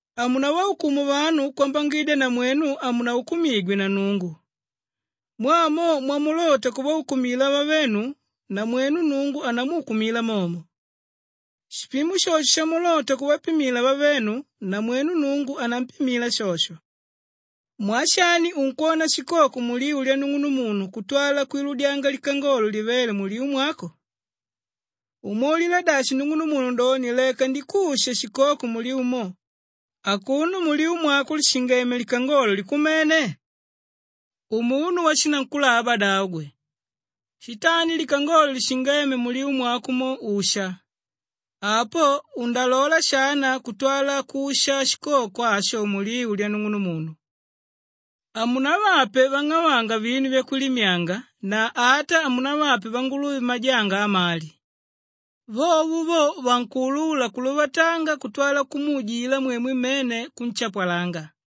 “Hamunavaukumu vanu kwambangidya namwenu hamunaukumigwe na Nnungu. Mwaa mo mwamulota kuvaukumila vavenu, namwenu Nnungu anamukumila momo. Shipimo shosho shamulota kuvapimila vavenu, namwenu Nnungu anampimila shosho. Mwaa shani unkwona shikoko muliu lyanung'unumunu kutwala kwiludyanga likangolo livéle muliu mwako? Umwaulila dashi nung'unumunu doni, ‘Leka ndikushe shikoko muliu mo,’ akuno muliu mwako lishingeme likangolo likumene? Umunu washinankulaba davo gwe! Shitandi likangolo lishingéme muliu mwako mo, usha. Apo undalola shana kutwala kusha shikoko asho muliu lyanung'unumunu. “Hamunavape vang'avanga vinu vyakwilimyanga na ata hamunavape vanguluve majanga amali. Vovo vo vankuulula kuluvatanga kutwala kumuujila mwemwe mmene kunshapwalanga.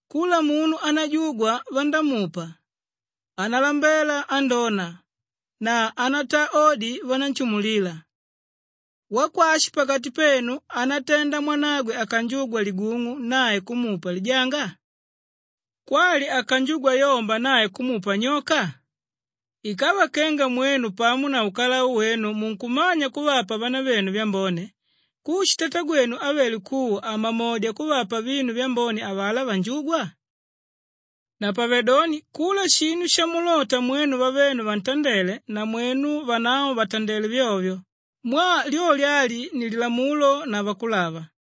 Kula munu ánajugwa vandámupa, ánalambela andóna na ánataa odi vanánshimulila. Wakwashi pakati penu ánatenda mwanagwe akanjugwa ligung'u nae kumupa lijanga? Kwali akanjugwa yomba nae kumupa nyoka? Ikava kenga mwenu pamo na ukalau wenu munkumanya kuvapa vanavenu vyambone, kushi Tatagwenu ávele kuwa hamamodya kuvapa vinu vyambone avalá vanjúgwa? Napavedoni kula shinu shamulota mwenu vavenu vantandele, namwenu vanavo vatandele vyovyo mwaa lyolyo ali ni Lilamulo na Vakulava.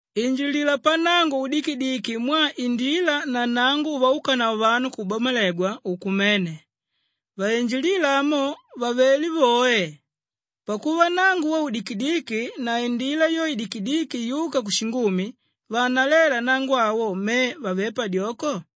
“Injilila pannango udikidiki mwaa indila na nnango uvaúkanavo vanu kukubamalegwa, ùkumene. Vainjilíla amo, vavelé voe. Pakuva nnango wo, ùdikidiki na indila yo, ìdikidiki yúka kushingumi, vaanaléla nnango awo me vavé padyoko!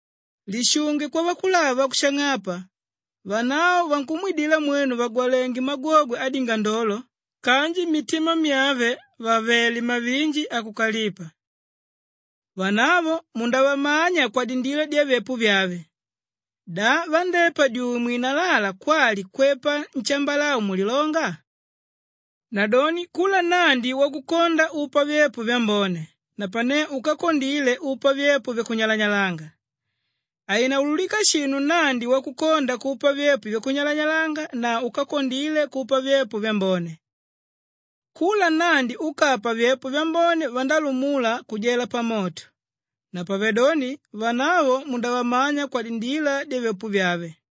“Lishunge kwavakulava vakushang'apa. Vanavo vankumwidila mwenu vàgwalenge magwogwe adingandolo kanji mmitima myave vàvele mavinji akukalipa. Vanavo mundavamanya kwadindila dyavyepo vyave. Da vandépa dyuwe mwinalala kwali kwepa nshambalau mulilonga? Nadoni kula nnandi wakukonda upa vyepo vyambone napane úkakondile upa vyepo vyakunyalanyalanga. Hainaulukika shinu nnandi wakukonda kupa vyepo vyakunyalanyalanga na úkakondile kupa vyepo vyambone. Kula nnandi úkapa vyepo vyambone vandálumula kujela pamoto. Napavedoni vanavo mundavamanya kwadindila dyavyepo vyave.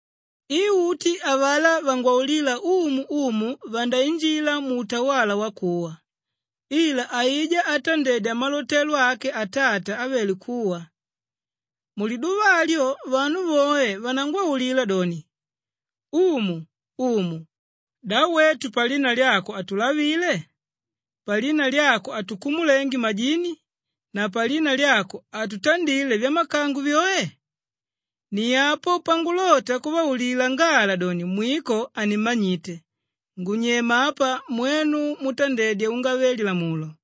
“I uti avalá vangwaulíla ‘Umu, Umu’ vandainjila muutawala wakuwa, ila aijá átandedya malotelo ake Atata ávele kuwa. Muliduva alyo vanu voe vanangwaulila doni, ‘Umu, Umu! Da wetu palina lyako hatulavile, palina lyako hatukumulenge majini na palina lyako hatutandile vyamakango vyoe?’ Ni apo pangulota kuvaulila ngala doni, ‘Mwiko hanimmanyite. Ngunyema apa mwenu mútandedya ungave-lilamulo.’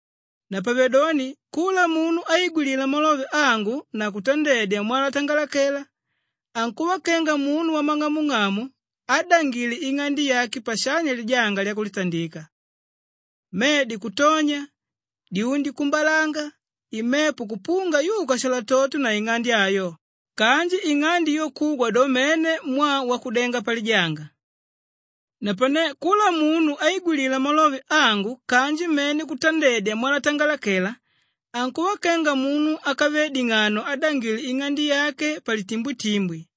“Napavedoni kula munu áigwilila malove angu na kutandedya mwalatangalakela, ankuva kenga munu wamang'amung'amu ádangile ing'ande yake pashanya lijanga lyakulitandika. Medi kutonya, dyundi kuumbalanga, imepo kupunga yuka shalatoto na ing'ande ayo kanji ing'ande yo kugwa do mene mwaa wakudenga palijanga. Napane kula munu áigwilila malove angu kanji mene kutandedya mwalatangalakela, ankuva kenga munu ákave ding'ano ádangile ing'ande yake palitimbwitimbwi.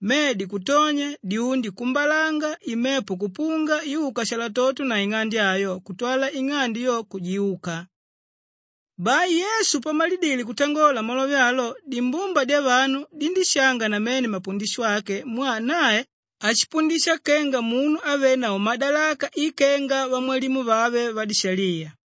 Medi kutonya, dyundi kuumbalanga, imepo kupunga yuka shalatoto na ing'ande ayo kutwala ing'ande yo, kujiuka.” Bai Yesu pamalidile kutangola malove alo, dimbumba dyavanu dindíshanga namene mapundisho ake mwaa nae ashipundisha kenga munu ávenavo madalaka i kenga vamwalimu vave vadishaliya.